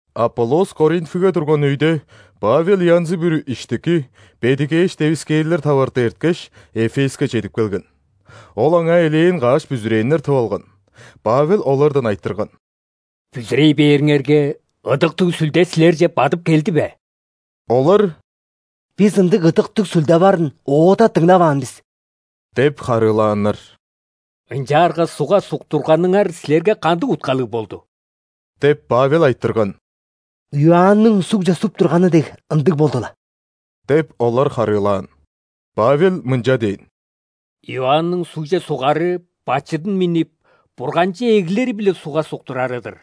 Аполлос Коринфиге турган өйде, Павел янзы-бүрү иштики, бедигээш девискээрлер таварты эрткеш, Эфеске чедип келген. Ол аңаа элээн каш бүзүрээннер тып алган. Павел олардан айтырган: «Бүзүрей бээриңерге, Ыдыктыг Сүлде силерже бадып келди бе?» Олар: «Бис ындыг Ыдыктыг Сүлде барын оода дыңнаваан бис» – деп харыылааннар. «Ынчаарга ·сугга суктурганыңар силерге кандыг уткалыг болду?» – деп, Павел айтырган. «Иоанның сугже суп турганы дег, ындыг болду-ла» – деп, олар харыылаан. Павел мынча дээн: «Иоанның сугже сугары – бачыдын миннип, Бурганче эглири-биле сугга суктурары-дыр.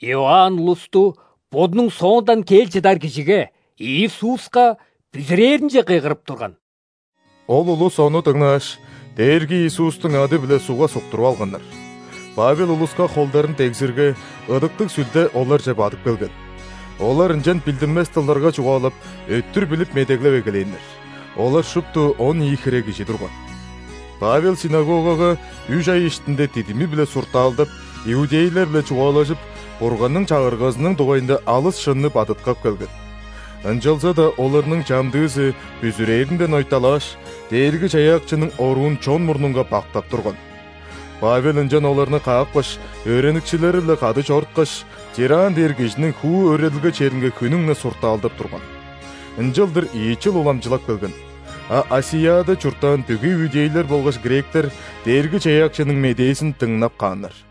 Иоанн улусту бодунуң соондан кел чыдар Кижиге – Иисуска бүзүрээринче кыйгырып турган». Ол улус ону дыңнааш, Дээрги Иисустуң ады-биле сугга суктуруп алганнар. Павел улуска холдарын дегзирге, Ыдыктыг Сүлде оларже бадып келген. Олар ынчан билдинмес дылдарга чугаалап, өттүр билип медеглеп эгелээннер. Олар шупту он ийи хире кижи турган. Павел ·синагогага үш ай иштинде дидими-биле суртаалдап, иудейлер-биле чугаалажып, Бурганның Чагыргазының дугайында алыс шынны бадыткап келген. Ынчалза-даа оларның чамдыызы бүзүрээринден ойталааш, Дээрги-Чаяакчының оруун чон мурнунга бактап турган. Павел ынчан оларны каапкаш, өөреникчилери-биле кады чоруткаш, Тиранн дээр кижиниң хуу өөредилге черинге хүннүң-не суртаалдап турган. Ынчалдыр ийи чыл уламчылап келген, а ·Асияда чурттаан бүгү иудейлер болгаш гректер Дээрги-Чаяакчының медээзин дыңнап кааннар.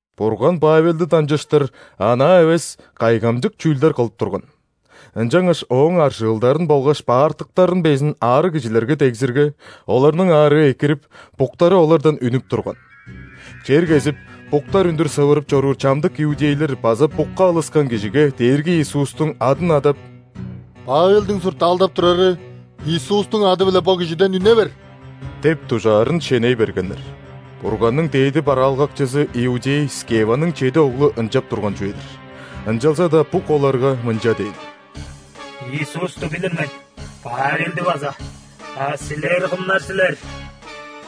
Бурган Павелди дамчыштыр анаа эвес кайгамчык чүүлдер кылып турган. Ынчангаш ооң аржыылдарын болгаш баартыктарын безин аарыг кижилерге дегзирге, оларның аарыы экирип, буктары олардан үнүп турган. Чер кезип, буктар үндүр сывырып чоруур чамдык иудейлер база букка алыскан кижиге Дээрги Иисустуң адын адап: «Павелдиң суртаалдап турары Иисустуң ады-биле бо кижиден үне бер» – деп дужаарын шеней бергеннер. Бурганның дээди бараалгакчызы иудей Скеваның чеди оглу ынчап турган чүве-дир. Ынчалза-даа бук оларга мынча дээн: «Иисусту билир мен, Павелди база, а силер кымнар силер?»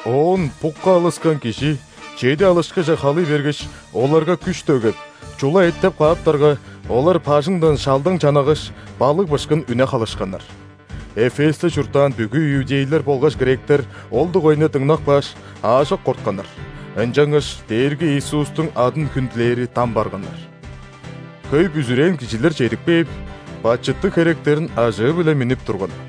Оон букка алыскан кижи чеди алышкыже халый бергеш, оларга күш дөгеп, чула эттеп кааптарга, олар бажыңдан шалдаң-чанагаш, балыг-бышкын үне халышканнар. Эфесте чурттаан бүгү иудейлер болгаш гректер ол дугайында дыңнап кааш, аажок кортканнар, ынчангаш Дээрги Иисустуң адын хүндүлээри дам барганнар. Хөй бүзүрээн кижилер чедип кээп, бачыттыг херектерин ажыы-биле миннип турган.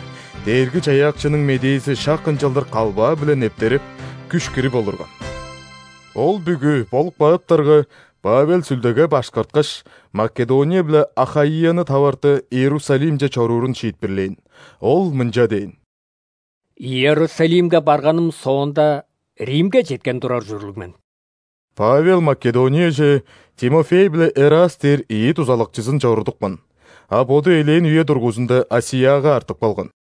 Дээрги-Чаяакчының медээзи шак ынчалдыр калбаа-биле нептереп, күш кирип олурган. Ол бүгү болуп кааптарга, Павел Сүлдеге башкарткаш, Македония биле Ахаияны таварты Иерусалимче чоруурун шиитпирлээн. Ол мынча дээн: «Иерусалимге барганым соонда, Римге четкен турар ужурлуг мен». Павел Македонияже Тимофей биле Эраст дээр ийи дузалакчызын чорудупкан, а боду элээн үе дургузунда ·Асияга артып калган.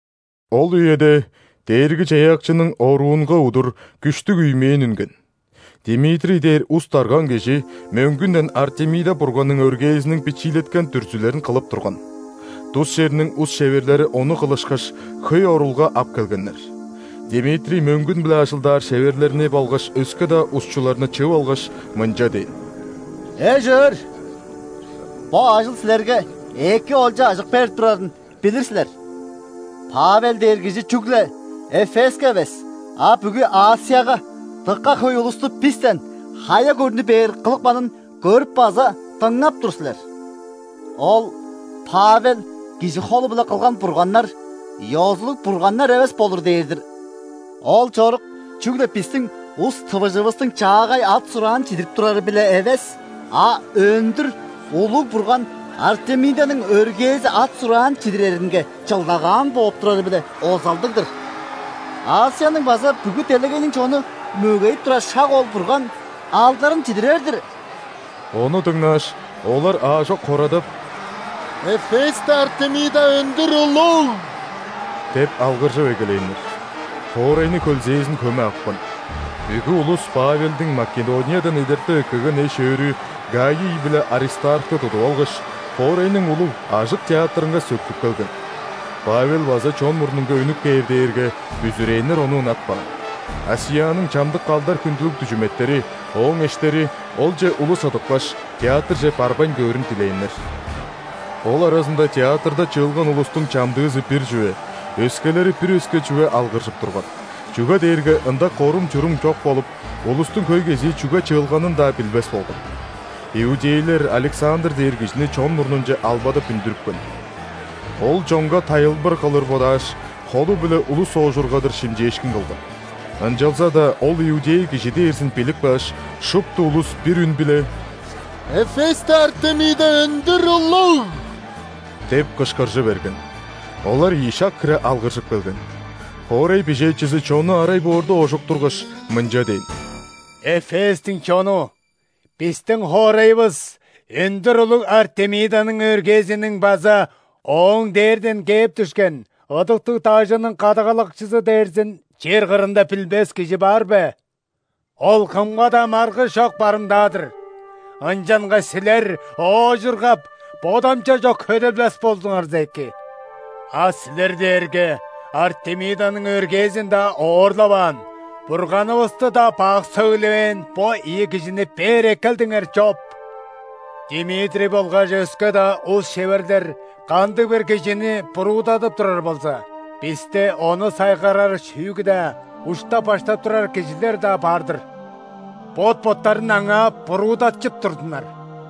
Ол үеде Дээрги-Чаяакчының оруунга удур күштүг үймээн үнген. Димитрий дээр ус-дарган кижи мөңгүнден Артемида бурганның өргээзиниң бичиилеткен дүрзүлерин кылып турган. Тус черниң ус-шеверлери ону кылышкаш, хөй орулга ап келгеннер. Димитрий мөңгүн-биле ажылдаар шеверлерни болгаш өске-даа усчуларны чыып алгаш, мынча дээн: «Эш-өөр! Бо ажыл силерге эки олча-ажык берип турарын билир силер. Павел дээр кижи чүгле Эфеске эвес, а бүгү ·Асияга дыка хөй улусту бистен хая көрнү бээр кылыпканын көрүп база дыңнап тур силер. Ол Павел кижи холу-биле кылган бурганнар – ёзулуг бурганнар эвес болур дээр-дир. Ол чорук чүгле бистиң ус-тывыжывыстың чаагай ат-сураан чидирип турары-биле эвес, а өндүр улуг бурган Артемиданың өргээзи ат-сураан чидиреринге чылдагаан бооп турары-биле озалдыг-дыр. Асияның база бүгү делегейниң чону мөгейип турар шак ол бурган алдарын чидирер-дир». Ону дыңнааш, олар аажок хорадап: «Эфесте Артемида өндүр улуг!» – деп алгыржып эгелээннер. Хоорайны хөлзээзин хөме апкан. Бүгү улус Павелдиң Македониядан эдертип эккелген эш-өөрү Гаий биле Аристархты тудуп алгаш, хоорайның улуг, ажык театрынга сөктүп келген. Павел база чон мурнунга үнүп кээр дээрге, бүзүрээннер ону ынатпаан. Асияның чамдык алдар-хүндүлүг дүжүметтери – ооң эштери, олче улус ыдыпкаш, театрже барбайн көөрүн дилээннер. Ол аразында театрда чыылган улустуң чамдыызы – бир чүве, өскелери – бир өске чүве алгыржып турган, чүге дээрге ында корум-чурум чок болуп, улустуң хөй кезии чүге чыылганын-даа билбес болган. Иудейлер Александр дээр кижини чон мурнунче албадап үндүрүпкен. Ол чонга тайылбыр кылыр бодааш, холу-биле улус оожургадыр шимчээшкин кылган. Ынчалза-даа ол иудей кижи дээрзин билип кааш, шупту улус бир үн-биле: «Эфесте Артемида өндүр улуг!» – деп кышкыржы берген. Олар ийи шак хире алгыржып келген. Хоорай бижээчизи чонну арай боорда оожуктургаш, мынча дээн: «Эфестиң чону, бистиң хоорайывыс – өндүр улуг Артемиданың өргээзиниң база ооң дээрден кээп дүшкен ыдыктыг дажының кадагалакчызы дээрзин чер кырында билбес кижи бар бе?! Ол кымга-даа маргыш чок барымдаа-дыр. Ынчангаш силер оожургап, бодамча чок хөделбес болзуңарза эки. А силер дээрге Артемиданың өргээзин-даа оорлаваан, бурганывысты-даа бак сөглевээн бо ийи кижини бээр эккелдиңер чоп. Димитрий болгаш өске-даа ус-шеверлер кандыг-бир кижини буруудадып турар болза, бисте ону сайгарар шүүгү-даа, уштап-баштап турар кижилер-даа бар-дыр. Бот-боттарын аңаа буруудатчып турзуннар.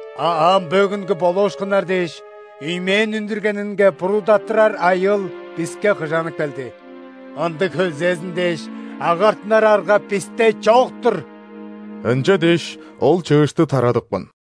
А ам бөгүнгү болуушкуннар дээш, үймээн үндүргенинге буруудаттырар айыыл биске кыжанып келди. Ындыг хөлзээзин дээш, агартынар арга бисте чок-тур». Ынча дээш, ол чыышты тарадыпкан.